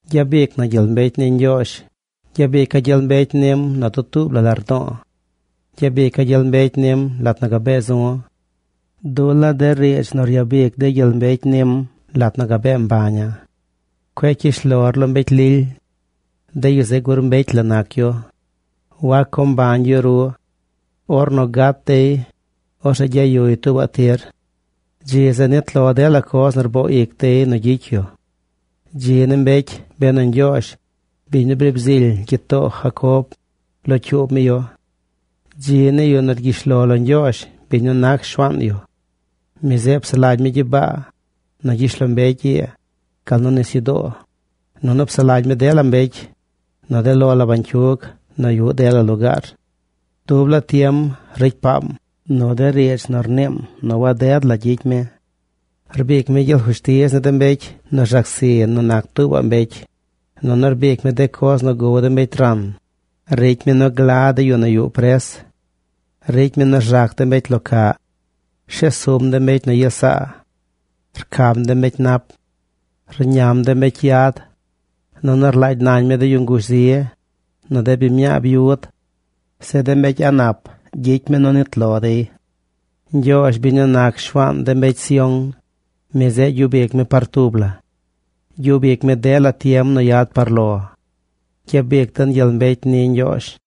¡Gyabic na gyel mbecy ni Ñgyoozh! Gyabica̱ gyel mbecy nim nu dutuub la lardo̱o̱. Gyabica̱ gyel mbecy nim lat nu gabee zu̱. Dula̱ de riidz nu ryabic de gyel mbecy nim lat nu gabee mbaña̱. Cueꞌ cyish lor lo mbecy lily. De yu zeꞌ gur mbecy la nac yu. Wac co mbañ yu ru. Ornu gat dey, orzeꞌ gyayuy tuubaꞌ tir. Dzi zeꞌ nit lo dela coz nu rboo ic dey nu gyicy yu. Dzi ni mbecy benu Ñgyoozh, biñ nu briib zily gyitoo Jacob, locyuub mi yu. Dzi ni yu nu rgyish lo lo Ñgyoozh biñ nu nac Shuaan yu. Mi zeꞌ psaꞌ lagy mi gyibaa, nu gyishlombecy ii, gal nu nisyudoo, nunu psaꞌ lagy mi dela mbecy, nu de lo la bañcyug nu yuꞌ dela lugaar. Dub laa tiem ricy paam nu de riidz nu rniim nu waded la gyicy mi. Rbic mi gyel fushtiz ni de mbecy nu rzac zi nu nac tuubaꞌ mbecy, nunu rbic mi de coz nu gow de mbecy ran. Ricy mi nu gla de yu nu yuꞌ pres. Ricy mi nu rzac de mbecy lo caꞌ. Rshes sum de mbecy nu yes saa. Rcam de mbecy nap. Rñam de mbecy yad, nunu rlaagy nañ mi de yu ngush zi, nu de biñ mñaa byud. Zeꞌ de mbecy a̱ꞌ nap ricy mi nu nit lo dey. Ñgyoozh, biñ nu nac Shuaan de mbecy Sión, mi zeꞌ gyub ic mi par tub la. Gyub ic mi dela tiem nu yad par lo. ¡Gyabic den gyel mbecy ni Ñgyoozh!